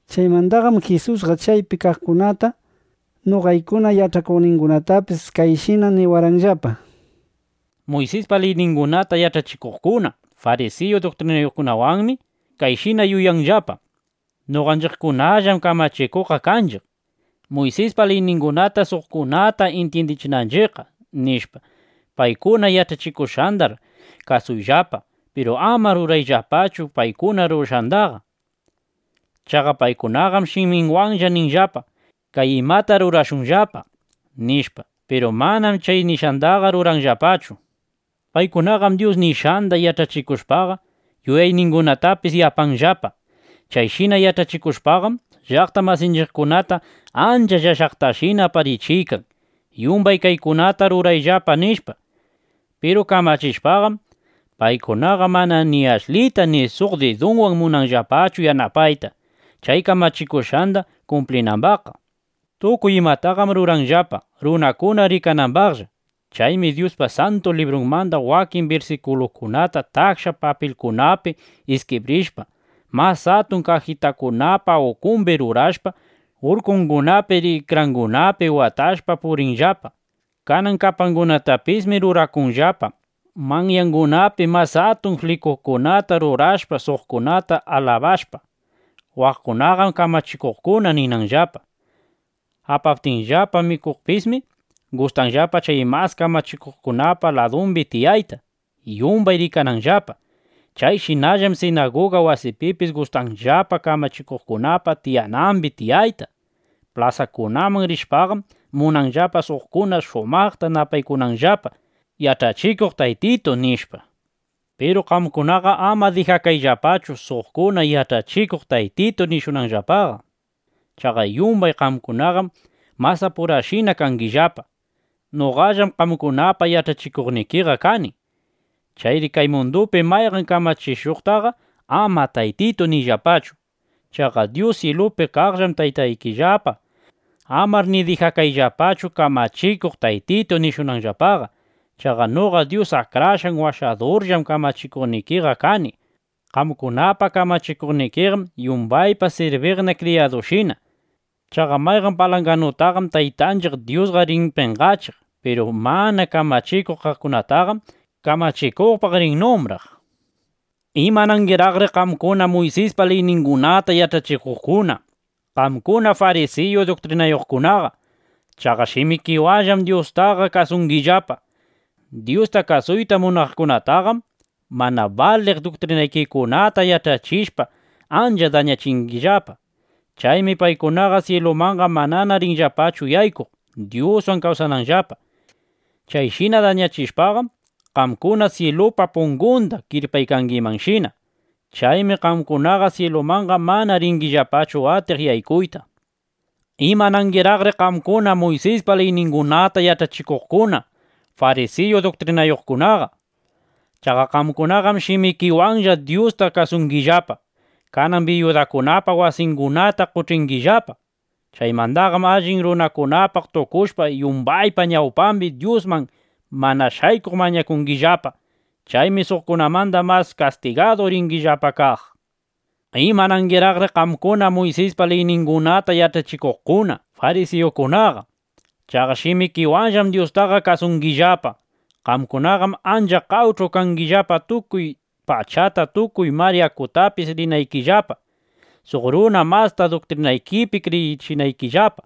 Chaymandaqam Jisusqa chaypi kaqkunata, noqaykuna yach'akuqnindapis kayshina niwarqanllapa: —Muysispa liyningunata yach'achikuqkuna, farisiyu duktrinayuqkunawanmi kayshina yuyanllapa: Noqanchiqkunallam kamachikuqqa kanchiq, Muysispa liyningunata suqkunata intyindichinanchiqqa, nishpa. Paykuna yach'achikushqandar kasuyllapa, piru ama rurayllapachu paykuna rurashqandaqa. Chaqa paykunaqam shiminwanlla ninllapa: “Kay imata rurashunllapa”, nishpa. Piru manam chay nishqandaqa ruranllapachu. Paykunaqam Dyus nishqanda yach'achikushpaqa, yuyayningunatapis yapanllapa. Chayshina yach'achikushpaqam, llaqta masinchiqkunata ancha llashaqtashina aparichiykan: “Yumbay kaykunata rurayllapa”, nishpa. Piru kamachishpaqam, paykunaqa mana ni ashlita ni suq didunwan munanllapachu yanapayta, chay kamachikushqanda kumplinambaqqa. ’Tukuy imataqam ruranllapa, runakuna rikanambaqlla. Chaymi Dyuspa Santu Librunmanda wakin birsikulukunata taksha papilkunapi iskibrishpa, mas atun kajitakunapa ukumbi rurashpa, urkungunapi, rikrangunapi watashpa purinllapa. Kanan kapangunatapismi rurakunllapa manyangunapi mas atun flikuskunata rurashpa, suqkuna alabashpa: “Waqkunaqam kamachikuqkuna”, ninanllapa. Apaptinllapa mikuqpismi, gustanllapa chay mas kamachikuqkunapa ladumbi tiyayta, yumbay rikananllapa. Chayshinallam sinaguga wasipipis gustanllapa kamachikuqkunapa tiyanambi tiyayta. Plasakunaman rishpam, munanllapa suqkuna shumaqta napaykunanllapa: “Yach'achikuq Taytitu”, nishpa. ’Piru qamkunaqa ama dijakayllapachu, suqkuna “Yach'achikuq Taytitu” nishunanllapaqa. Chaqa yumbay qamkunaqam masapurashinalla kangillapa. Noqallam qamkunapa yach'achikuqnikiqa kani. Chayri kay mundupi mayqan kamachikuqtaqa ama “Taytitu” niyllapachu. Chaqa Dyus syilupi kaqllam Taytaykillapaqa. Amar ni dijakayllapachu: “Kamachikuq Taytitu” nishunanllapaqa. Chaqa noqa Dyus Akrashqan Washadurllam kamachikuqnikiqa kani. Qamkunapa kamachikuqnikiqam yumbayta sirbinqa kriyadushina. Chaqa mayqan palanganutaqam Taytanchiq Dyusqa rin penqachiq. Piru mana kamachikuq kaqkunataqam kamachikuqpaq rin numbraq. ’¡Imanangiraqri qamkuna Muysispa liyningunata yach'achikuqkuna, qamkuna farisiyu duktrinayuqkunaqa! ¡Chaqa shimikiwanllam Dyustaqa kasungillapa! Dyusta kasuyta munaqkunataqam mana baliq duktrinaykikunata yach'achishpa, ancha dañachingillapa. Chaymi paykunaqa syilumanqa manana rinllapachu yaykuq, Dyuswan kawsananllapa. Chayshina dañachishpaqam, qamkuna syilupa pungunda kirpaykangishina. Chaymi qamkunaqa syilumanqa mana ringillapachu atiq yaykuyta. ˻ ’¡Imanangiraqri qamkuna Muysispa liyningunata yach'achikuqkuna, farisiyu duktrinayuqkunaqa! ¡Chaqa qamkunaqam shimikiwanlla Dyusta kasungillapa! Kanan biyudakunapa wasingunata qoch'ingillapa. Chaymandaqam allin runakunapaq tukushpa, yumbaypa ñawpambi Dyusman mana shaykuq mañakungillapa. Chaymi suqkunamanda mas kastigadu ringillapa kaq.˼ ’¡Imanangiraqri qamkuna Muysispa liyningunata yach'achikuqkuna, farisiyukunaqa! ¡Chaqa shimikiwanllam Dyustaqa kasungillapa! Qamkunaqam ancha qawch'u kangillapa, tukuy pachata, tukuy mar yakutapis rinaykillapa, suq runa masta duktrinaykipi kriyichinaykillapa.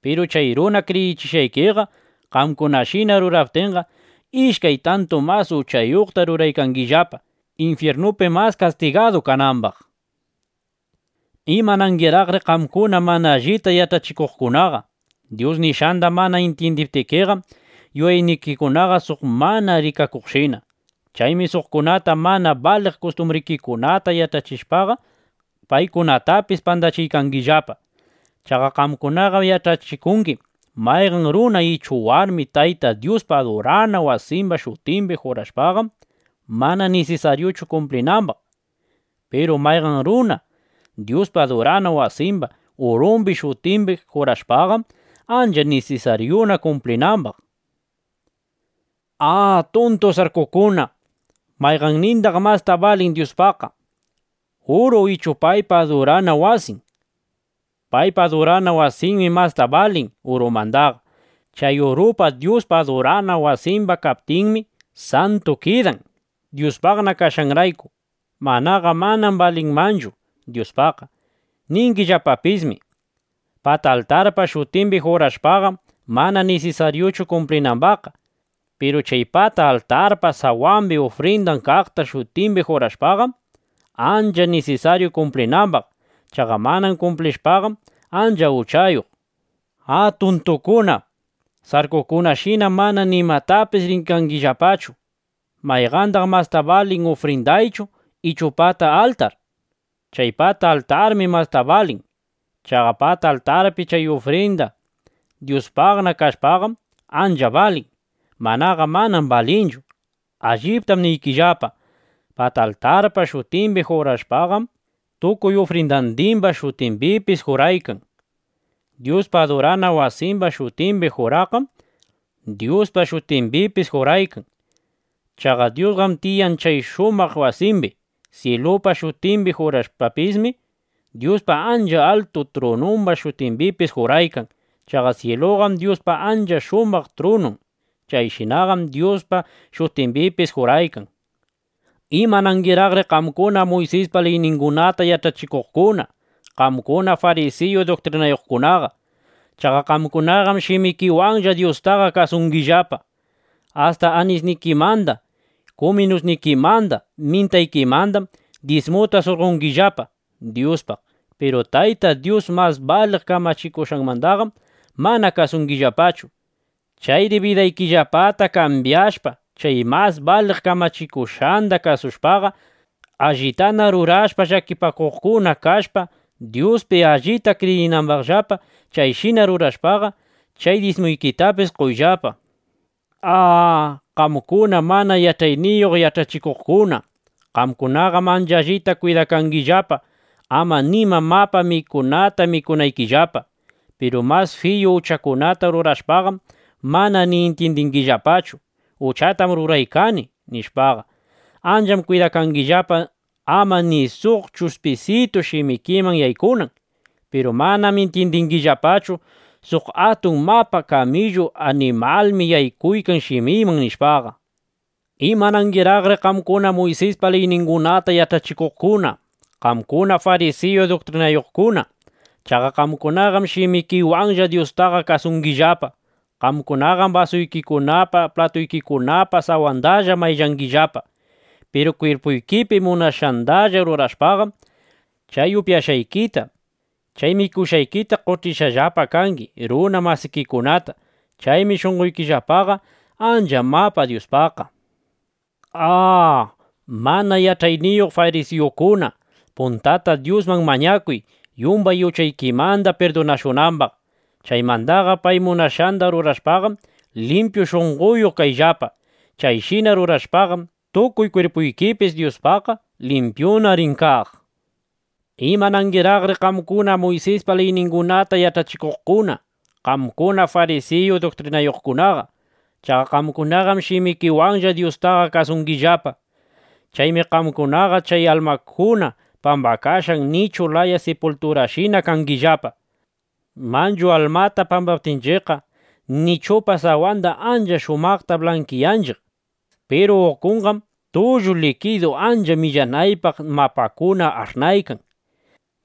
Piru chay runa kriyichishqaykiqa qamkunashina ruraptinqam, ishkay tantu mas uchayuqta ruraykangillapa, infyirnupi mas kastigadu kanambaq. ’¡Imanangiraqri qamkuna mana allita yach'achikuqkunaqa! Dyus nishqanda mana intyindiptikiqam, yuyaynikikunaqa suq mana rikakuqshina. Chaymi suqkunata mana baliq kustumbrikikunata yach'achishpaqa, paykunatapis pandachingillapa. Chaqa qamkunaqam yach'achikungi: Mayqan runa ichu warmi Tayta Dyuspa adurana wasimba shutimbi jurashpaqam, mana nisisaryuchu kumplinambaq. Piru mayqan runa Dyuspa adurana wasimba urumba shutimbi jurashpaqam, ancha nisisaryuna kumplinambaq, nishpa. ¡A, tuntu sarkukunashina! ¿Mayqannindaq masta balin Dyuspaqqa, uru ichu paypa adurana wasin? Paypa adurana wasinmi masta balin urumandaqa. Chay uruqa Dyuspa adurana wasimba kaptinmi santu kidan, Dyuspaqna kashqanrayku. Manaqa manam balinmanchu Dyuspaqqa. Ningillapapismi: “Pata altarpa shutimbi jurashpaqam, mana nisisaryuchu kumplinambaqqa. Piru chay pata altarpa sawambi ufrinda kaqpa shutimbi jurashpaqam, ancha nisisaryu kumplinambaq. Chaqa mana kumplishpaqam ancha uchayuq”, nishpa. ¡A tuntukuna! ¡Sarkukunashinam mana nimatapis rikangillapachu! ¿Mayqandaq masta balin, ufrindachu ichu pata altar? Chay pata altarmi mastaqa balin. Chaqa pata altarpi chay ufrinda Dyuspaqna kashpaqam, ancha balin. Manaqa manam balinchu. Alliptam niykillapa, pata altarpa shutimbi juraqqam, tukuy ufrindandimba shutimbipis juraykan. Dyuspa adurana wasimba shutimbi juraqqam, Dyuspa shutimbipis juraykan. Chaqa Dyusqam tiyan chay shumaq wasimbi. Syilupa shutimbi juraqpismi, Dyuspa ancha altu trunumba shutimbipis juraykan. Chaqa syiluqam Dyuspa ancha shumaq trunun. Chayshinaqam Dyuspa shutimbipis juraykan. ’¡Imanangiraqri qamkuna Muysispa liyningunata yach'achikuqkuna, qamkuna farisiyu duktrinayuqkunaqa! ¡Chaqa qamkunaqam shimikiwanlla Dyustaqa kasungillapa! Asta anisnikimanda, kuminusnikimanda mintaykimandam dyismuta surqongillapa Dyuspaq. Piru Tayta Dyus mas baliq kamachikushqandaqam mana kasungillapachu. Chayri bidaykillapata kambyashpa, chay mas baliq kamachikushqanda kasushpaqa, allitana rurashpa, llakipakuqkuna kashpa, Dyuspi allita kriyingimanllapa. Chayshina rurashpaqa, chay dyismuykitapis qoyllapa. ¡A, qamkuna, mana yach'ayniyuq yach'achikuqkuna! Qamkunaqam ancha allita kwidakangillapa, ama nima mapa mikunata mikunaykillapa. Piru mas fiyu uchakunata rurashpaqam, mana ni intyindingillapachu: Uchatam ruraykani, nishpaqa. Ancham kwidakangillapa, ama ni suq chushpisitu shimikiman yaykunan. Piru manam intyindingillapachu: Suq atun mapa kamillu animalmi yaykuykan shimiyman, nishpaqa. ’¡Imanangiraqri qamkuna Muysispa liyningunata yach'achikuqkuna, qamkuna farisiyu duktrinayuqkuna! ¡Chaqa qamkunaqam shimikiwanlla Dyustaqa kasungillapa! Qamkunaqam basuykikunapa, platuykikunapa sawandalla mayllangillapa, piru kwirpuyki munashqandalla rurashpaqam, chay upyashqaykita, chay mikushqaykita qoch'ishqallapa kangi runa masikikunata. Chaymi shunqoykillapaqa ancha mapa Dyuspaqqa. ¡A, mana yach'ayniyuq farisiyukuna! Puntata Dyusman mañakuy, yumbay uchaykimanda pirdunashunambaq. Chaymandaqa pay munashqanda rurashpaqam, limpyu shunqoyuq kayllapa. Chayshina rurashpaqam, tukuy kwirpuykipis Dyuspaqqa limpyuna rin kaq. ’¡Imanangiraqri qamkuna Muysispa liyningunata yach'achikuqkuna, qamkuna farisiyu duktrinayuqkunaqa! ¡Chaqa qamkunaqam shimikiwanlla Dyustaqa kasungillapa! Chaymi qamkunaqa chay almakuna pambakashqa nichu laya sipulturashina kangillapa. Manchu almata pambaptinchiqqa, nichupa sawanda ancha shumaqta blankiyanchiq. Piru ukunqam tullu likidu ancha millanaypaq mapakuna ash'naykan.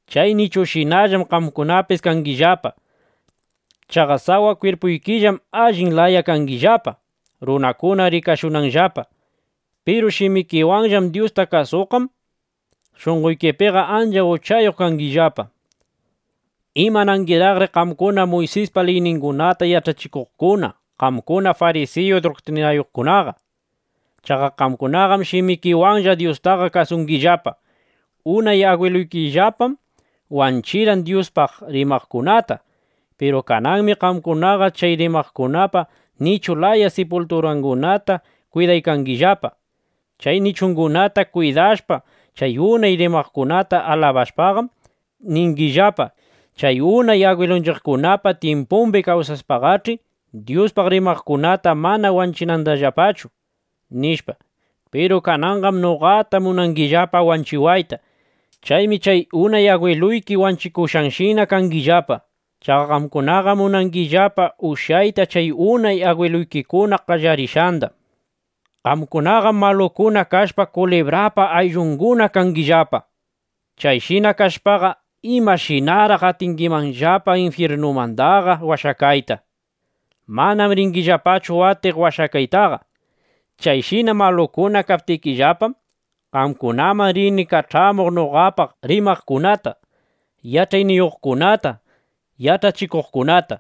Chay nichushinallam qamkunapis kangillapa. Chaqa sawa kwirpuykillam allin laya kangillapa, runakuna rikashunanllapa. Piru shimikiwanlla Dyusta kasushpaqam, shunqoykipiqa ancha uchayuq kangillapa. ’¡Imanangiraqri qamkuna Muysispa liyningunata yach'achikuqkuna, qamkuna farisiyu duktrinayuqkunaqa! ¡Chaqa qamkunaqam shimikiwanlla Dyustaqa kasungillapa! Unay agwiluykillapam wanchirqan Dyuspaq rimaqkunata. Piru kananmi qamkunaqa chay rimaqkunapa nichu laya sipulturangunata kwidaykangillapa. Chay nichungunata kwidashpa, chay unay rimaqkunata alabashpaqam, ningillapa: “Chay unay agwilunchiqkunapa tyimpumbi kawsashpaqach'i, Dyuspaq rimaqkunata mana wanchinayllapatachu”, nishpa. (Piru kananqam noqata munangillapa wanchiwayta.) Chaymi chay unay agwiluyki wanchikuqkunashina kangillapa. Chaqa qamkunaqam munangillapa ushyayta chay unay agwiluykikuna qallarishqanda. ’¡Qamkunaqam malukuna kashpa, kulibrapa ayllunguna kangillapa! Chayshina kashpaqa, ¿imashinaraq atingimanllapa infyirnumandaqa washakayta? Manam ringillapachu atiq washakaytaqa. Chayshina malukuna kaptikillapam, qamkunaman rini kach'amuq noqapaq rimaqkunata, yach'ayniyuqkunata, yach'achikuqkunata.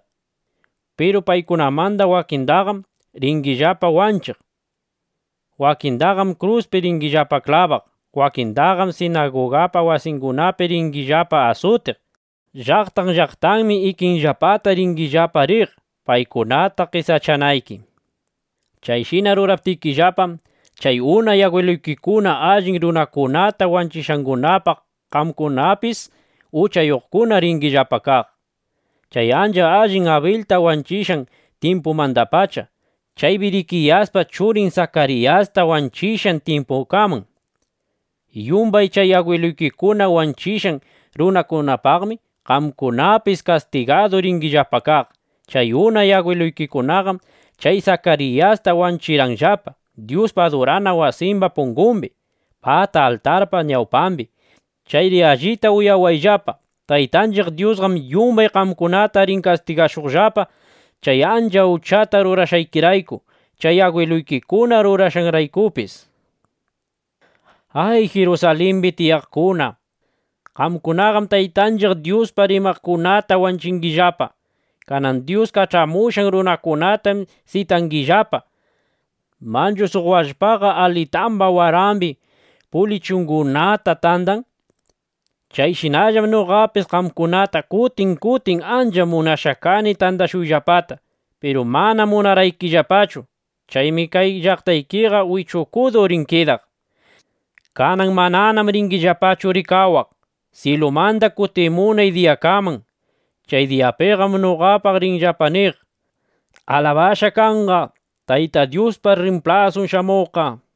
Piru paykunamanda wakindaqam ringillapa wanchiq. Wakindaqam kruspi ringillapa klabaq. Wakindaqam sinaguga wasikunapi ringillapa asutiq. Llaqtan llaqtanmi ikinllapata ringillapa riq, paykunata qesachanayki. Chayshina ruraptikillapam, chay unay agwiluykikuna allin runakunata wanchishqangunapaq qamkunapis uchayuqkuna ringillapa kaq. Chay ancha allin Abilta wanchishqan tyimpumandapacha, chay Birikiyaspa churin Sakariyasta wanchishqan tyimpukaman, yumbay chay agwiluykikuna wanchishqan runakunapaqmi qamkunapis kastigadu ringillapa kaq. Chay unay agwiluykikunaqam chay Sakariyasta wanchirqanllapa Dyuspa adurana wasimba pungumbi, pata altarpa ñawpambi. Chayri allita uyawayllapa, Taytanchiq Dyusqam yumbay qamkunata rin kastigashuqllapa, chay ancha uchata rurashqaykirayku, chay agwiluykikuna rurashqanraykupis. ’¡Ay, Jirusalimbi tiyaqkuna! Qamkunaqam Taytanchiq Dyuspaq rimaqkunata wanchingillapa. Kanan Dyus kach'amushqan runakunatam sitangillapa. Manchu suq wallpaqa alitamba warambi pulichitungunata tandan. Chayshinallam noqapis qamkunata kutin kutin ancha munashqa kani tandashuyllapata, piru mana munarqaykillapachu. Chaymi kay llaqtaykiqa wichukudu rin kidaq. Kanan mananam ringillapachu rikawaq, syilumanda kutimunay diyakaman. Chay diyapiqam noqapaq ringillapa niq: “¡Alabashqa kanqa Tayta Dyuspa rrimplasun shamuqqa!” nishpa.